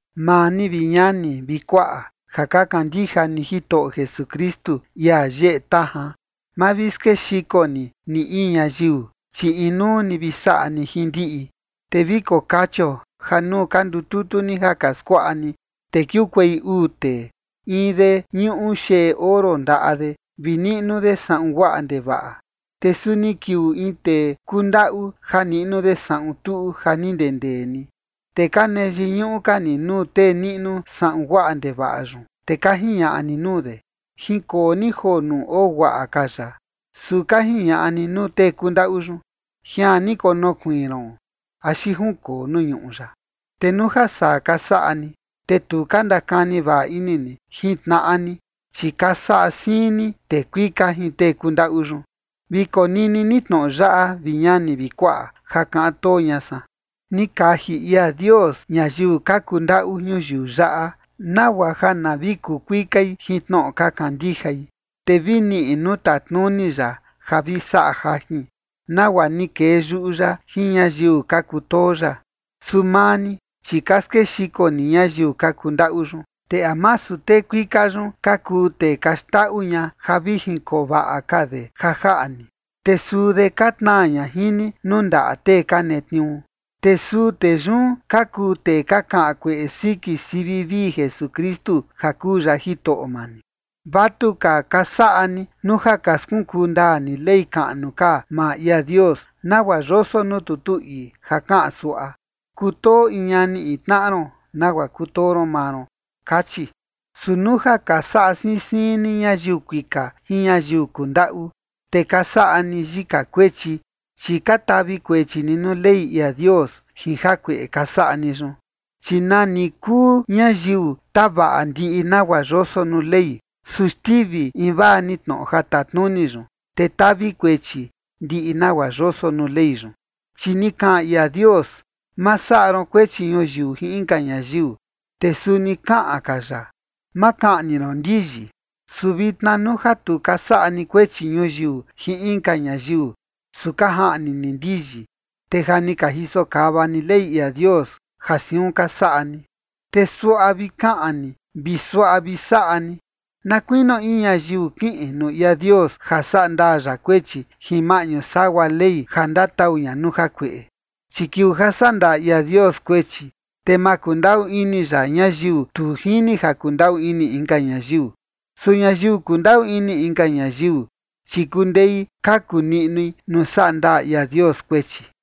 Maa ni, vi ñani vi kuaꞌa, ja ka kandija ni Jitoꞌo Jesukristu, ia yeꞌe tajan, ma vi skexiko ni, ni in ñayiu, chi inuu ni vi saꞌa ni jin ndiꞌi. Te vi kokachio ja nuu ka ndututu ni ja ka skuaꞌa ni, te kiukuei uu tee. In de ñuꞌu xeꞌe oro ndaꞌa de vi niꞌnu de saꞌun guaꞌa ndevaꞌa. Te suni kiuu in tee kundaꞌu ja niꞌnu de saꞌun tuꞌu ja ni ndendee ni. Te ka nee yiñuꞌu ka ni nuu tee niꞌnu saꞌun guaꞌa ndevaꞌa yun, te ka jiñaꞌa ni nuu de: “Jinkoo ni joo nuu oo guaꞌa ka yaꞌa”. Su ka jiñaꞌa ni nuu tee kundaꞌu yun: “Jian ni konokuiin ron” axi “Jinkoo nuu ñuꞌu yaꞌa”. Te nuu ja saa ka saꞌa ni, te tu ka ndakani vaꞌa ini ni jin tnaꞌa ni, chi ka saꞌa siin ni tee kuika jin tee kundaꞌu yun. Vi konini ni tnoꞌo yaꞌa, vi ñani vi kuaꞌa, ja kaꞌan too ña san: ni kaji ia Dios ñayiu ka kundaꞌu ñuyiu yaꞌa nagua ja na vi kukuikai jin tnoꞌo ka kandijai, te vi niꞌi nuu tatnuni ya ja vi saꞌa jajin, nagua ni kee yuꞌu ya jin ñayiu ka kutoo ya. Su maa ni, chi ka skexiko ni ñayiu ka kundaꞌu yun. ¿Te a masu tee kuika yun ka kuu tee ka xndaꞌu ña ja vi jinkoo vaꞌa ka de ja jaꞌa ni? Te suu de ka tnaa ña jin ni nuu ndaꞌa tee ka netniuu. Te suu tee yun ka kuu tee ka kaꞌan kueꞌe siki sivi vii Jesukristu ja kuu ya Jitoꞌo maa ni. Vatuka ka saꞌa ni nuu ja ka skunkuu ndaa ni ley kaꞌnu ka maa ia Dios nagua yoso nuu tutu ii ja kaꞌan suaꞌa: “Kutoo in ñani in tnaꞌa ron nagua kutoo ron maa ron”, kachi. Su nuu ja ka saꞌa siin siin ni ñayiu kuika jin ñayiu kundaꞌu, te ka saꞌa ni yika kuechi, chi ka tavi kuechi ni nuu Ley ia Dios jin jakueꞌe ka saꞌa ni yun. Chi nani kuu ñayiu tavaꞌa ndiꞌi nagua yoso nuu Ley, su xtivi invaa ni tnoꞌo ja tatnuni yun, te tavi kuechi ndiꞌi nagua yoso nuu Ley yun. Chi ni kaꞌan ia Dios: “Ma saꞌa ron kuechi ñuyiu jin inka ñayiu”. Te suni kaꞌan ka ya: “Ma kaꞌni ron ndiyi”. Su vitna nuu ja tu ka saꞌa ni kuechi ñuyiu jin inka ñayiu su ka jaꞌni ni ndiyi, te ja ni ka jiso kava ni Ley ia Dios ja siun ka saꞌa ni. Te suaꞌa vi kaꞌan ni vi suaꞌa vi saꞌa ni na kuinio in ñayiu kiꞌin nuu ia Dios ja saꞌa ndaa ya kuechi jin maꞌñu sagua Ley ja ndatau ña nuu jakueꞌe. Chi kiuu ja saꞌa ndaa ia Dios kuechi, te ma kundaꞌu ini ya ñayiu tu jini ja kundaꞌu ini inka ñayiu. Su ñayiu kundaꞌu ini inka ñayiu, chi kundei kaku niꞌnui nuu saꞌa ndaa ia Dios kuechi.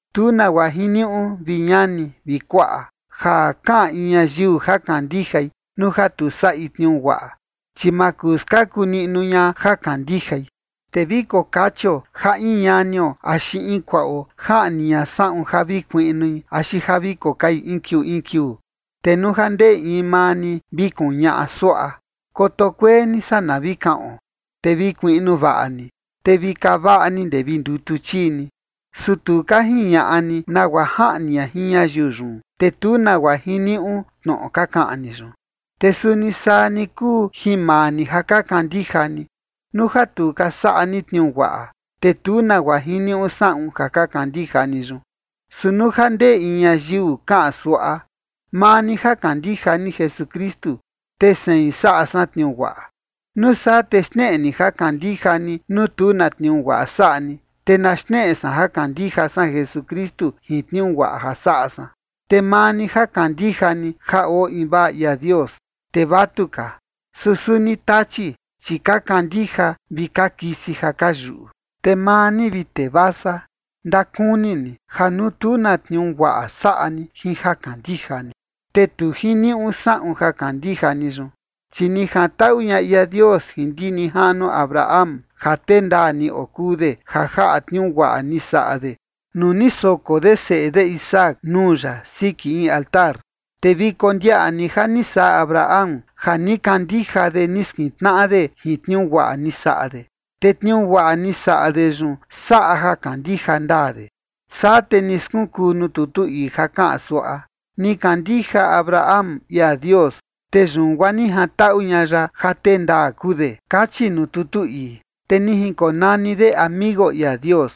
Tu nagua jiniuꞌu, vi ñani vi kuaꞌa, ja kaꞌan in ñayiu ja kandijai nuu ja tu saꞌi tniuu guaꞌa, chi maa kuu skaku niꞌnu ña ja kandijai. Te vi kokachio ja in ñanio axi in kuaꞌo jaꞌni ña saꞌun ja vi kuiꞌnui axi ja vi kokai in kiuu in kiuu. Te nuu ja ndee in maa ni vi kuñaꞌa suaꞌa: “Koto kuee ni, saa na kaꞌon, te vi kuiꞌnu vaꞌa ni, te vi kaa vaꞌa ni ndee vi ndutu chii ni”, su tu ka jiñaꞌa ni nagua jaꞌni ña jin ñayiu yun, te tu nagua jiniuꞌu tnoꞌo ka kaꞌan ni yun. Te suni saa ni kuu jin maa ni ja ka kandija ni: nuu ja tu ka saꞌa ni tniuu guaꞌa, te tu nagua jiniuꞌu saꞌun ja ka kandija ni yun. Su nuu ja ndee in ñayiu kaꞌan suaꞌa: “Maa ni ja kandija ni Jesukristu, te sein saꞌa san tniuu guaꞌa”. Nuu saa, te xneꞌe ni ja kandija ni nuu tu na tniuu guaꞌa saꞌa ni, te na xneꞌe san ja kandija san Jesukristu jin tniuu guaꞌa ja saꞌa san. Te maa ni ja kandija ni ja oo invaa ia Dios, te vatuka, su suni tachi, chi ka kandija vi ka kisi ja ka yuꞌu. Te maa ni, vi tee vasa, ndakuni ni ja nuu tu na tniuu guaꞌa saꞌa ni jin ja kandija ni, te tu jiniuꞌu saꞌun ja kandija ni yun. Chi ni jantaꞌu ña ia Dios jin ndi nijaꞌnuo Abraham ja tee ndaa ni okuu de ja jaꞌa tniuu guaꞌa ni saꞌa de nuu ni soko de seꞌe de Isaac nuu ya siki in altar. Te vi kondiaꞌa ni ja ni saꞌa Abraham, ja ni kandija de ni skintnaꞌa de jin tniuu guaꞌa ni saꞌa de, te tniuu guaꞌa ni saꞌa de yun saꞌa ja kandija ndaa de. Saa te ni skunkuu nuu tutu ii ja kaꞌan suaꞌa: “Ni kandija Abraham ia Dios, te yun guaa ni jantaꞌu ña ya ja tee ndaa kuu de” kachi nuu tutu ii. Te ni jinkonani de amigo ia Dios.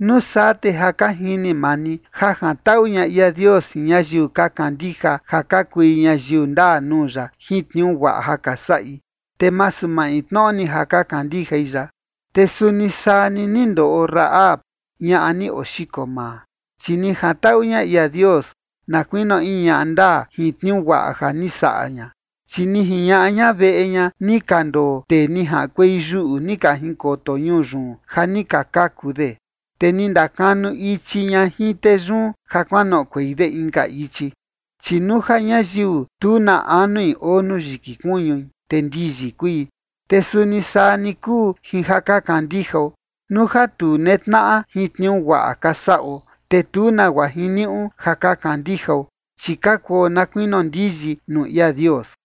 Nuu saa te ja ka jini maa ni ja jantaꞌu ña ia Dios jin ñayiu ka kandija ja ka kui ñayiu ndaa nuu ya jin tniuu guaꞌa ja ka saꞌi, te masu maintnoꞌo ni ja ka kandijai ya. Te suni saa ni, ni ndoꞌo Rahab, ñaꞌa ni oxiko maa, chi ni jantaꞌu ña ia Dios na kuinio in ñaꞌa ndaa jin tniuu guaꞌa ja ni saꞌa ña. Chi ni jiñaꞌa ña veꞌe ña ni ka ndoo tee ni jaꞌankuei yuꞌu ni ka jinkoto ñuu yun ja ni ka kaku de, te ni ndakanu ichi ña jin tee yun ja kuanoꞌokuei de inka ichi. Chi nuu ja ñayiu tu na anui oo nuu yiki kuñui, te ndiyi kui. Te suni saa ni kuu jin ja ka kandijao: nuu ja tu netnaꞌa jin tniuu guaꞌa ka saꞌo, te tu nagua jiniuꞌu ja ka kandijao, chi ka kuo na kuinio ndiyi nuu ia Dios.